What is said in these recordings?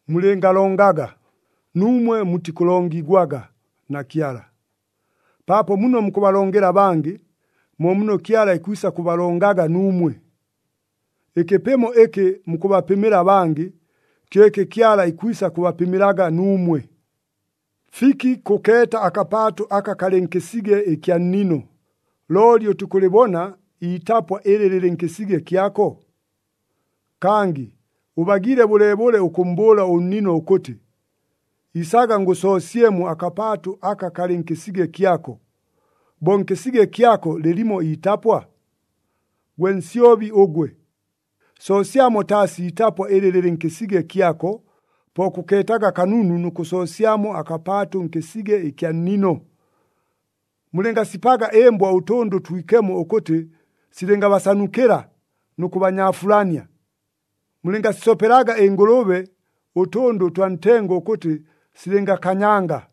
“Mulɨngalongaga, nuumwe mutikʉlongigwaga na Kyala, paapo muno mukʉbalongela abangɨ, mo muno Kyala ikwisa kʉbalongelaga nuumwe. Ɨkɨpɨmo ɨkɨ mukʉbapɨmɨla abangɨ, kyo ɨkɨ Kyala ikwisa kʉbapɨmɨlaga nuumwe. “Fiki kʉkeeta akapaatʉ aka kalɨ nkɨsige ɨkya nnino, looli ʉtikʉlɨbona iitapwa ɨlɨ lɨlɨ nkɨsige kyako? Kangɨ ʉbagiile bʉleebʉle ʉkʉmmbʉʉla ʉnnino ʉkʉtɨ, ‘Isaga ngʉsoosyemo akapaatʉ aka kalɨ nkɨsige kyako,’ bo nkɨsige kyako lɨlimo itapwa? Gwe nsyobi ʉgwe! Soosyamo taasi iitapwa ɨlɨ lɨlɨ nkɨsige kyako, po kʉkeetaga kanunu nʉ kʉsoosyamo akapaatʉ nkɨsige ɨkya nnino! “Mulɨngasipaga ɨmbwa ʉtʉndʉ ʉtwikemo ʉkʉtɨ silɨngabasanukɨla nʉ kʉbanyaafulania. Mulɨngasisopelaga ɨngʉlʉbe ʉtʉndʉ ʉtwa ntengo ʉkʉtɨ silɨngakanyanga.”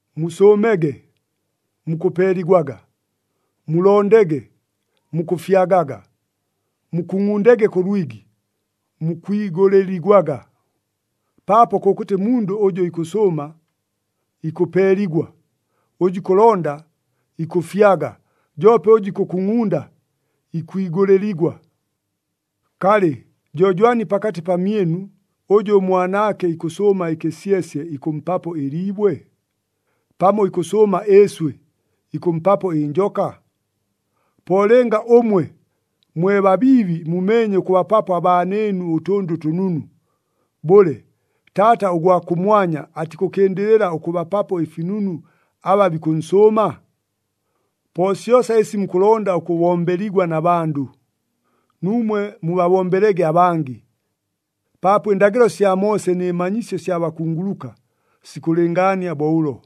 “Musʉʉmege, mukʉpeeligwaga; mulondege, mukʉfyagaga; mukungʼundege kʉ lwigi, mukwigʉlɨligwaga. Paapo kʉkʉtɨ mundʉ ʉjʉ ikʉsʉʉma, ikʉpeeligwa, ʉjʉ ikʉlonda, ikʉfyaga, joope ʉjʉ ikʉkungʼunda, ikwigʉlɨligwa. “Kalɨ, jo jwani pakatɨ pamyɨnu, ʉjʉ ʉmwanaake ikʉsʉʉma ɨkɨsyesye ikʉmpapo ɨliibwe? Pamo ikʉsʉʉma ɨɨswɨ, ikʉmpapo ɨnjoka? Po lɨnga ʉmwe, mwe babiibi mumeenye ʉkʉbapapo abaanɨɨnu ʉtʉndʉ ʉtʉnunu, bʉle, Taata ʉgwa kʉmwanya atikʉkɨndɨlɨla ʉkʉbapapo ɨfinunu aba bikʉnsʉʉma? “Po syosa ɨsi mukʉlonda ʉkʉbombeligwa na bandʉ, nuumwe mubabombelege abangɨ. Paapo ɨndagɨlo sya Moose nɨ manyisyo sya bakunguluka, sikʉlɨngaania bo ʉlo.”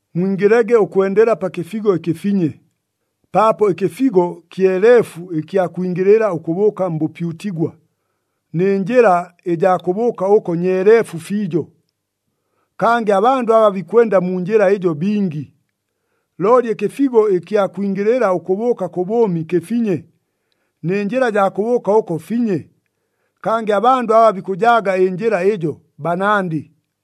“Mwingɨlege ʉkwendela pa kɨfigo ɨkɨfinye, paapo ɨkɨfigo kyeleefu ɨkya kwingɨlɨla ʉkʉbʉʉka mbʉpyutigwa, nɨ njɨla ɨjaa kʉbʉʉka ʉko nyeeleefu fiijo. Kangɨ abandʉ aba bikwenda mu njɨla ɨjo bingi. Looli ɨkɨfigo ɨkya kwingɨlɨla ʉkʉbʉʉka kʉ bʉʉmi kɨfinye, nɨ njɨla ɨjaa kʉbʉʉka ʉko finye, kangɨ abandʉ aba bikʉjaaga ɨnjɨla ɨjo banandɨ.”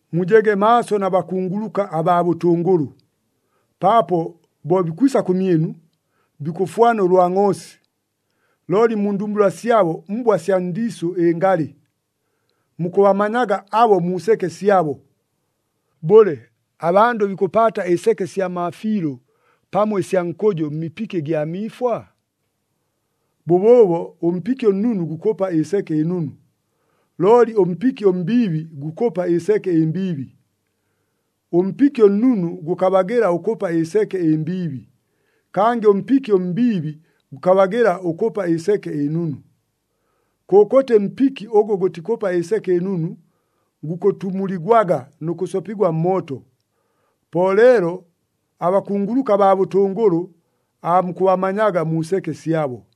“Mujege maaso na bakunguluka abaa bʉtʉngʉlʉ, paapo bo bikwisa kʉmyɨnu, bikʉfwana ʉlwa ngʼoosi, looli mu ndumbula syabo mbwa sya ndiisʉ ɨngalɨ. Mukʉbamanyaga abo mu seke syabo. Bʉle, abandʉ bikʉpaata ɨseke sya maafiilʉ pamo ɨsya nkʉjʉ mmipiki ɨgya miifwa? Bʉbʉʉbo ʉmpiki ʉnnunu gukʉpa ɨseke ɨnunu, looli ʉmpiki ʉmbiibi gukʉpa ɨseke ɨmbiibi. Ʉmpiki ʉnnunu gʉkabagɨla ʉkʉpa ɨseke ɨmbiibi, kangɨ ʉmpiki ʉmbiibi gʉkabagɨla ʉkʉpa ɨseke ɨnunu. Kʉkʉtɨ mpiki ʉgʉ gʉtikʉpa ɨseke ɨnunu, gukʉtumuligwaga nʉ kʉsopigwa mmooto. Po leelo abakunguluka abaa bʉtʉngʉlʉ aamukʉbamanyaga mu seke syabo.”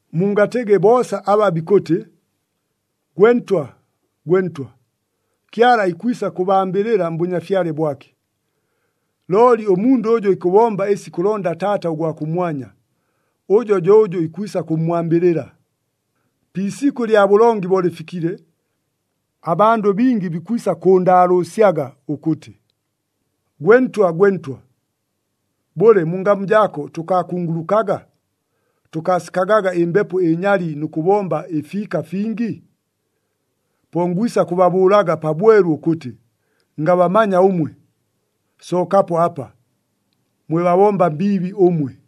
“Mungatɨgɨ boosa aba bikʉtɨ, ‘Gwe Ntwa, gwe Ntwa,’ Kyala ikwisa kʉbambɨlɨla mBʉnyafyale bwake. Looli ʉmundʉ ʉjʉ ikʉbomba ɨsi ikʉlonda Taata ʉgwa kʉmwanya, ʉjo jo ʉjʉ ikwisa kʉmmwambɨlɨla. Pi isikʉ lya bʉlongi bo lɨfikile, abandʉ bingi bikwisa kʉʉndaalʉʉsyaga ʉkʉtɨ, ‘Gwe Ntwa, gwe Ntwa! Bʉle, mu ngamu jaako tʉkaakungulukaga, tʉkaasikagaga ɨmbepo ɨnyali nʉ kʉbomba ɨfiika fingi?’ Po ngwisa kʉbabʉʉlaga pabwelu ʉkʉtɨ, ‘Ngabamanya ʉmwe! Sookapo apa, mwe babomba mbiibi ʉmwe!’”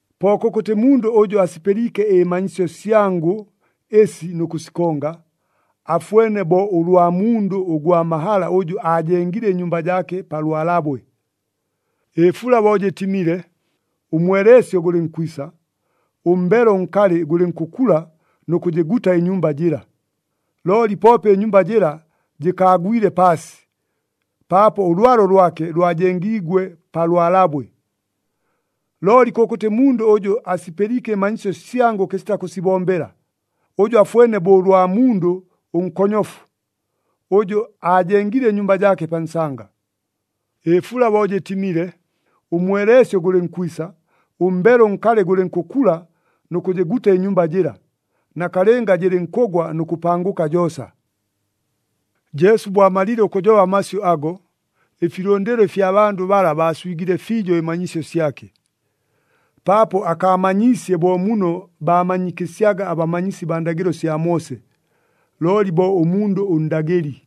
“Po kʉkʉtɨ mundʉ ʉjʉ asipɨliike ɨmanyisyo syangʉ ɨsi nʉ kʉsikonga, afwene bo ʉlwa mundʉ ʉgwa mahala ʉjʉ aajengile ɨnyumba jaake pa lwalabwe. Ɨfula bo jɨtimile, ʉmweleesyo gʉlɨnkwisa, ʉmbelo ʉnkalɨ gʉlɨnkʉkula nʉ kʉjɨguta ɨnyumba jɨla, looli poope ɨnyumba jɨla jɨkaagwile paasi, paapo ʉlwalo lwake lwajengiigwe pa lwalabwe. Looli kʉkʉtɨ mundʉ ʉjʉ asipɨliike ɨmanyisyo syangʉ kɨsita kʉsibombela, ʉjo afwene bo ʉlwa mundʉ ʉnkonyofu, ʉjʉ aajengile ɨnyumba jaake pa nsanga. Ɨfula bo jɨtimile, ʉmweleesyo gʉlɨnkwisa, ʉmbelo ʉnkalɨ gʉlɨnkʉkula nʉ kʉjɨguta ɨnyumba jɨla, nakalɨnga jɨlɨnkʉgwa nʉ kʉpangʉka joosa.” Jesu bo amalile ʉkʉjoba amasyʉ ago, ɨfilʉndɨlo ɨfya bandʉ bala baaswigile fiijo ɨmanyisyo syake. Paapo akaamanyiisye bo muno baamanyikɨsyaga abamanyisi baa ndagɨlo sya Moose, looli bo ʉmundʉ ʉndagɨli.